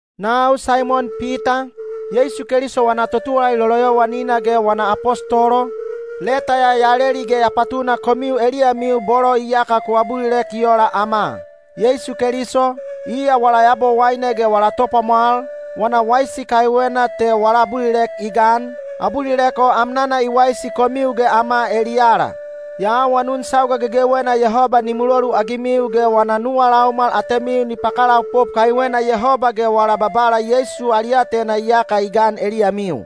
Nau Saimon Pita, Yeisu Keliso wana totuwalali loloyowanina ge wana apostolo, leta ya ya leli ge ya patuna komiu eliyamiu bolo iyaka ku abulilek i ola ama. Yeisu Keliso, iya wala Yabowaine ge wala Topwamwal, wana waisi kaiwena te wala abulilek i gan, abulilek o amnana i waisi komiu ge ama eliyala. Ya awanun sauga gegewena Yehoba ni muloluagimiu ge wana nuwa laumwal atemiu ni pakalaopop kaiwena Yehoba ge wala Babala Yeisu ali aatena iyaka i gan eliyamiu.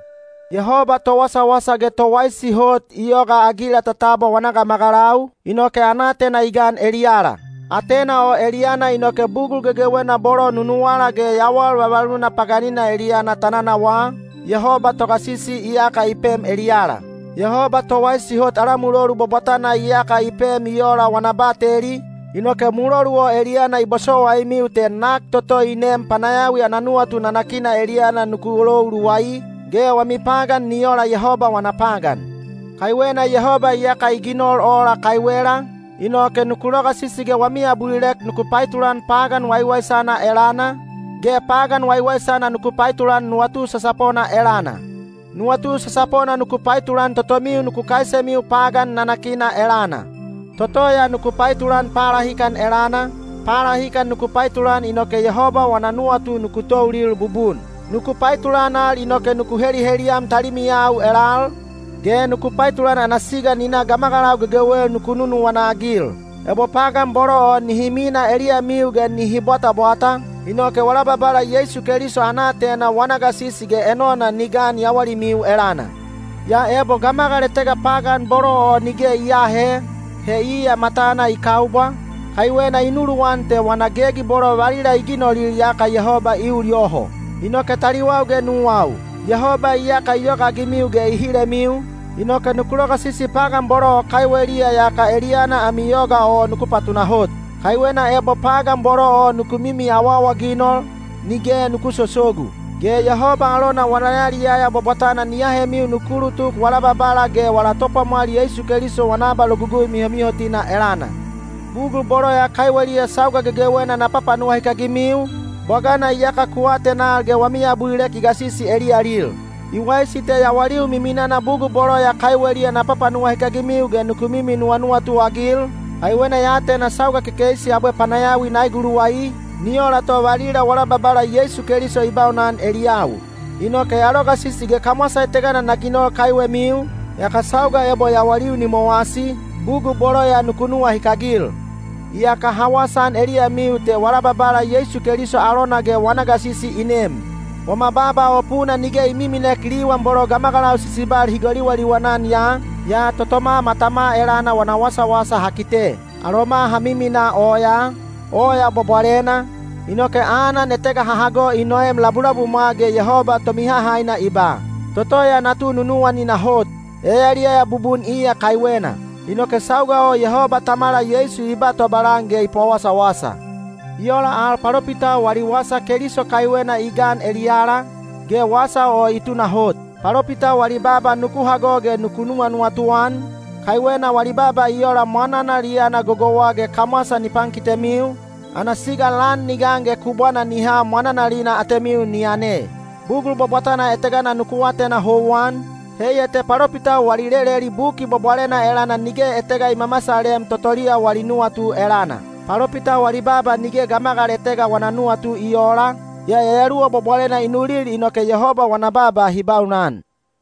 Yehoba towasawasa ge towaisi hot i yogaagila ta tabwa wana gamagalau, inoke ana aatena i gan eliyala. Aatena o eliyana inoke bugul gegewena bolo nunuwala ge yawal vavaluna paganina eliyana ta nanawaa, Yehoba Togasisi iyaka i pem eliyala. Yehoba towaisi hot ala mulolu bwabwatana iyaka i pem i ola wana bateli, inoke mulolu o eliyana i bosowaimiu te nak toto i neem panayawi ana nuwatu nanakina eliyana nuku lou luwai, ge wami pagan ni ola Yehoba wana pagan. Kaiwena Yehoba iyaka i ginol ola kaiwela, inoke nuku logasisi ge wami abulilek nuku paetulan pagan waiwaisana elana, ge pagan waiwaisana nuku paetulan nuwatu sasapona elana. Nuwatu sasapona nuku paetulan totomiu nuku kaisemiu pagan nanakina elana. Toto ya nuku paetulan palahikan elana, palahikan nuku paetulan inoke Yehoba wana nuwatu nuku toulil bubun. Nuku paetulan al inoke nuku heliheliyam talimiyau elal, ge nuku paetulan ana siga ni na gamagalau gegewel nuku nunuwana-agil. Ebo pagan bolo o nihi minaa eliyamiu ge nihi bwatabwata, inoke wala Babala Yeisu Keliso ana aatena wana gasisi ge enona ni gan yawalimiu elana. Yaa ebo gamagal etega pagan bolo o nige i aahe, he iya matana i kaubwa, kaiwena i nuluwan te wana gegi bolo valila i ginolil iyaka Yehoba i ul yoho. Inoke taliwau ge nuwau, Yehoba iyaka i yogaagimiu ge i hilemiu, inoke nuku logasisi pagan bolo o kaiweliya yaka eliyana ami yoga o nuku patunahot. Kaiwena ebo pagan bolo o nuku mimi awaawaginol, nige nuku sosogu. Ge Yehoba alona wana yaliyaya bwabwatana ni ahemiu nuku ulutuk wala Babala ge wala Topwamwal Yeisu Keliso wana abalogugui mihomihotina elana. Bugul bolo ya kaiweliya sauga gegewena na papanuwahikagimiu, bwagana iyaka ku atenal ge wami abulilek i gasisi eliyalil. I waisi te yawaliu miminana bugul bolo ya kaiweliya na papanuwahikagimiu ge nuku mimi nuwanuwatu-agil, kaiwena ya atena sauga kekeisi abwe panayawi na eguluwai, ni ola to valila wala Babala Yeisu Keliso i baunan eliyau. Inoke ya logasisi ge kamwasa etega na ginol kaiwemiu, yaka sauga ebo yawaliu ni mowasi, bugul bolo ya nuku nuwahikagil. Iyaka ha wasaan eliyamiu te wala Babala Yeisu Keliso alona ge wana gasisi i nem. Wama baaba o puna nige i miminek liwan bolo gamagalau sisibal hi goliwaliwan-an ya, yaa totoma matama elana wana wasawasa ha kite. Aloma ha miminaa oyaa, oya bwabwalena, inoke anan etega ha hago i noem labulabumwa ge Yehoba Tomihahaina i ba, “Toto ya natu nunuwanina hot; ya yaliyaya bubun iya kaiwena.” Inoke sauga o Yehoba Tamala Yeisu i ba tobalan ge i pawasawasa. I ola al palopitau wali wasa Keliso kaiwena i gan eliyala, ge wasa o i tunahot. Palopitau wali baaba nuku hago ge nuku nuwanuwatu-an, kaiwena wali baaba i ola mwananal i yana gogouwa ge kamwasa ni pankitemiu, ana siga lan ni gan ge kubwana ni ha mwananalina atemiu ni yane. Bugul bwabwatana etega nuku atena houwan, heiya te palopitau wali leleli Buki Bwabwalena elana nige etega i mamasalem totoliya wali nuwatu elana. Palopitau wali baaba nige gamagal etega wana nuwatu i oola, yaa Yayaluwa Bwabwalena i nulil inoke Yehoba wana baaba hi baunan.